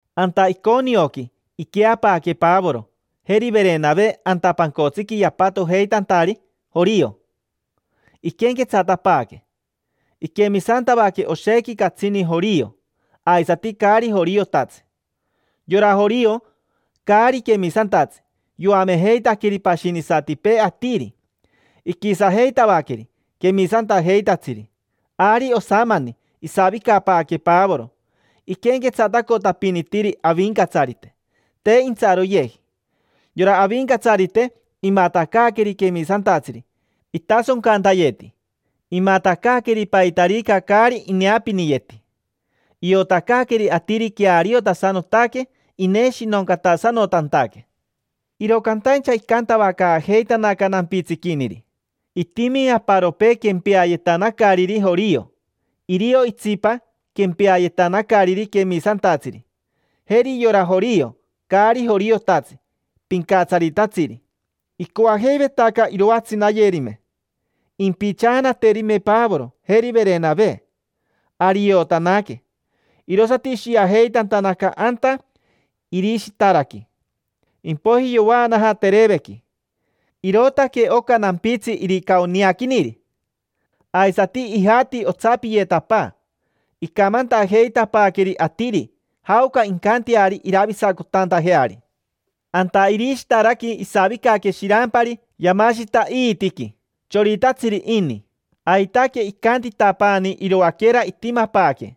Anta Iconioqui iqueapaaque Pavoro, jeri Verenave, anta pancotsiqui yapatojeitantari jorio, iquenquetsatapaaque. Iquemisantavaque oshequi catsini jorio, aisati caari joriotatsi. Yora jorio, caari quemisantatsi, yoamejeitaqueri pashinisatipee atiri, iquisajeitavaqueri quemisantajeitatsiri. Ari osamani isavicapaaque Pavoro, iquenquetsatacotapinitiri Avincatsarite, te intsaroyeji. Yora Avincatsarite, imatacaaqueri quemisantatsiri itasoncantayeti, imatacaaqueri paitarica caari ineapiniyeti. Iotacaaqueri atiri queariotasanotaque ineshinoncatasanotantaque. Iro cantaincha icantavacaajeitanaca nampitsiquiniri. Itimi aparopee quempeayetanacariri jorio. Irio itsipa quempeayetanacariri quemisantatsiri. Jeri yora jorio, caari joriotatsi, pincatsaritatsiri: icoajeivetaca iroatsinayerime, impichaanaterime Pavoro, jeri Verenave. Ari iotanaque, irosati ishiajeitantanaca anta Irishitaraqui. Impoiji yovaanaja Terevequi. Irootaque oca nampitsi Iricaoniaquiniri. Aisati ijati otsapiyetapaa, icamantajeitapaaqueri atiri jaoca incanteari iravisacotantajeari. Anta Irishitaraqui isavicaque shirampari yamashita iitiqui. Choritatsiri ini. Aitaque icantitapaani iroaquera itimapaaque.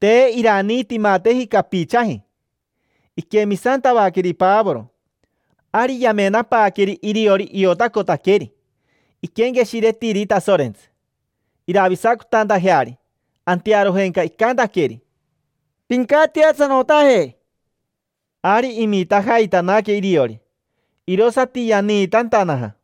Te iraniitimateji capichaji. Iquemisantavaqueri Pavoro. Ari yamenapaaqueri iriori iotacotaqueri, iquenqueshiretiri Tasorentsi, iravisacotantajeari. Antearojenca icantaqueri: —Pincatiasanotaje. Ari imitajaitanaque iriori, mita, irosati yaniitantanaja.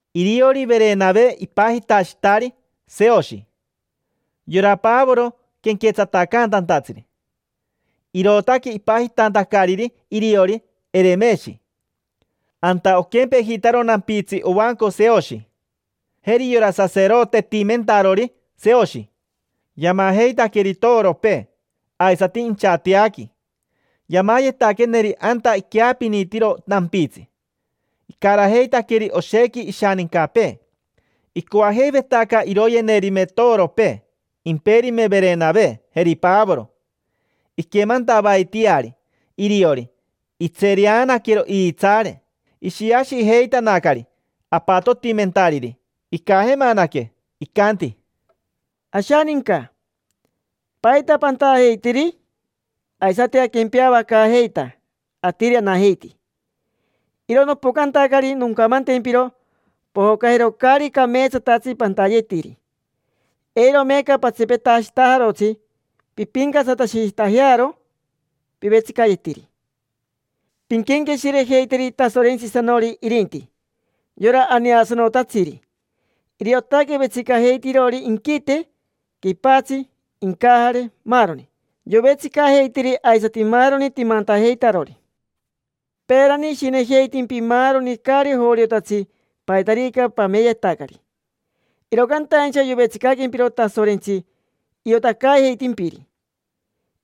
Iriori Verenave ipajitashitari Seoshi. Yora Pavoro quenquetsatacaantatsiri, irootaque ipajitantacariri iriori Eremeshi. Anta oquempejitaro nampitsi ovanco Seoshi. Jeri yora saserotetimentarori Seoshi, yamajeitaqueri toropee, aisati inchateaqui. Yamayetaqueneri anta iqueapinitiro nampitsi, icarajeitaqueri oshequi ishanincapee. Icoajeivetaca iroyenerime toropee; imperime Verenave, jeri Pavoro. Iquemantavaitiari iriori, itsereanaquero iitsaare. Ishiashijeitanacari apatotimentariri. Icajemanaque, icanti: —Ashaninca. ¿Paita pantajeitiri? Aisati aquempeavacaajeita, atiri anajeiti. Iro nopocantacari noncamantempiro pojocajero caari cameetsatatsi pantayetiri. Eiro meeca patsipetashitajarotsi pimpincatsatashitajearo pivetsicayetiri. Pinquenqueshirejeiteri Tasorentsisanori irinti, yora aneasanotatsiri. Iriotaque vetsicajeitirori inquite, quipatsi, incajare, maaroni; yovetsicajeitiri aisati maaroni timantajeitarori. Peerani ishinejeitimpi maaroni caari joriotatsi paitarica pameyetacari. Iro cantaincha yovetsicaquempiro Tasorentsi iotacaajeitimpiri.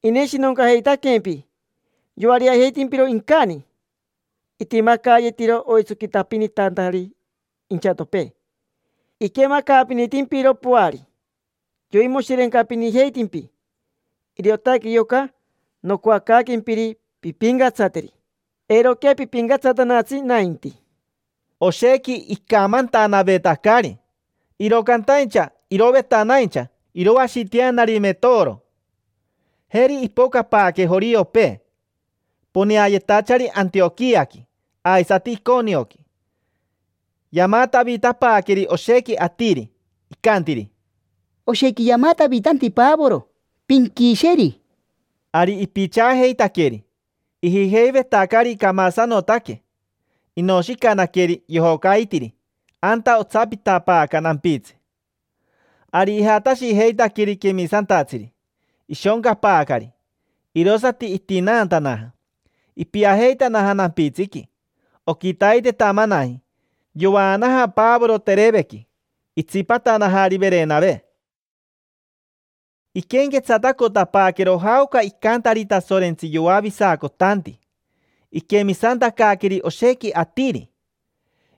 Ineshinoncajeitaquempi. Yoariajeitimpiro incani. Itimacayetiro oitsoquitapinitantari inchatopee. Iquemacaapinitimpiro poari. Yoimoshirencapinijeitimpi. Iriotaque yoca nocoacaaquempiri pimpincatsateri: eiroquea pipincatsatanatsi nainti. Oshequi icamantanavetacari, iro cantaincha irovetanaincha iroashiteanarime toro. Jeri ipocapaaque joriopee, poneayetachari Antioquiaqui aisati Iconioqui. Yamatavitapaaqueri oshequi atiri, icantiri: —Oshequi yamatavitanti Pavoro: pinquisheri. Ari ipichaajeitaqueri, ijijeivetacari camasanotaque. Inoshicanaqueri, yojocaitiri anta otsapitapaaca nampitsi. Ari ijatashijeitaqueri quemisantatsiri, ishoncapaacari; irosati itinaantanaja. Ipiajeitanaja nampitsiqui. Oquitaitetamanaji yovaanaja Pavoro Terevequi, itsipatanajari Verenave. Iquenquetsatacotapaaquero jaoca icantari Tasorentsi yoavisacotanti. Iquemisantacaaqueri oshequi atiri.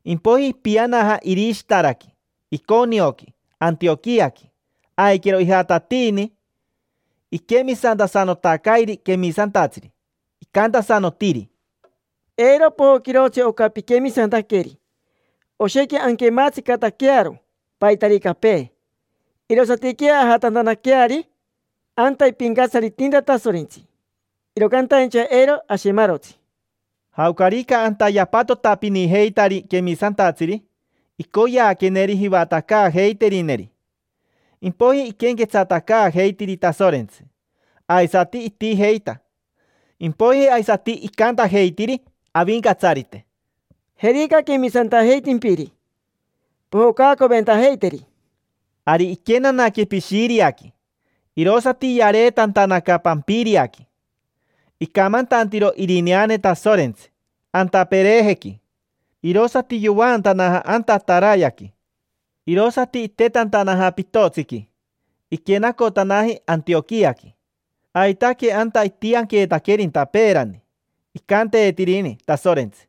Impoiji ipianaja Irishitaraqui, Iconioqui, Antioquiaqui. Aiquero ijatatiini iquemisantasanotacairi quemisantatsiri. Icantasanotiri: —Eiro pojoquirotsi oca piquemisantaqueri. Oshequi anquematsicataquearo paitaricapee, irosatiquea ajatantanaqueari anta ipincatsaritinta Tasorentsi; iro cantaincha eiro ashemarotsi. Jaocarica anta yapatotapinijeitari quemisantatsiri, icoyeaqueneri jivatacaajeiterineri. Impoiji iquenquetsatacaajeitiri Tasorentsi, aisati itijeita. Impoiji aisati icantajeitiri Avincatsarite: —Jerica quemisantajeitimpiri. Pojocacoventajeiteri. Ari iquenanaque Pishiriaqui, irosati yareetantanaca Pampiriaqui. Icamantantiro irineane Tasorentsi anta Perejequi, irosati yovaatanaja anta Atarayaqui. Irosati itetantanaja pitotsiqui, iquenacotanaji Antioquiaqui. Aitaque anta itianqueetaquerinta peerani, icanteetirini Tasorentsi: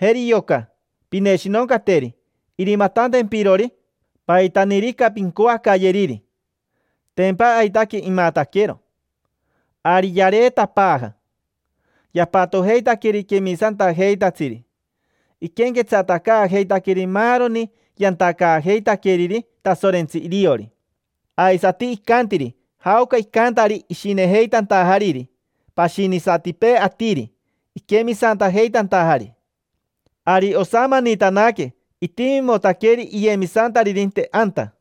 “Jeri yoca, pineshinoncateri irimatantempirori paitanirica pincoacayeriri”. Tempa aitaque imataquero. Ari yareetapaaja. Yapatojeitaqueri quemisantajeitatsiri. Iquenquetsatacaajeitaqueri maaroni yantacaajeitaqueriri Tasorentsi iriori. Aisati icantiri jaoca icantari ishinejeitantajariri pashinisatipee atiri iquemisantajeitantajari. Ari osamanitanaque itimimotaqueri iyemisantaririnte anta.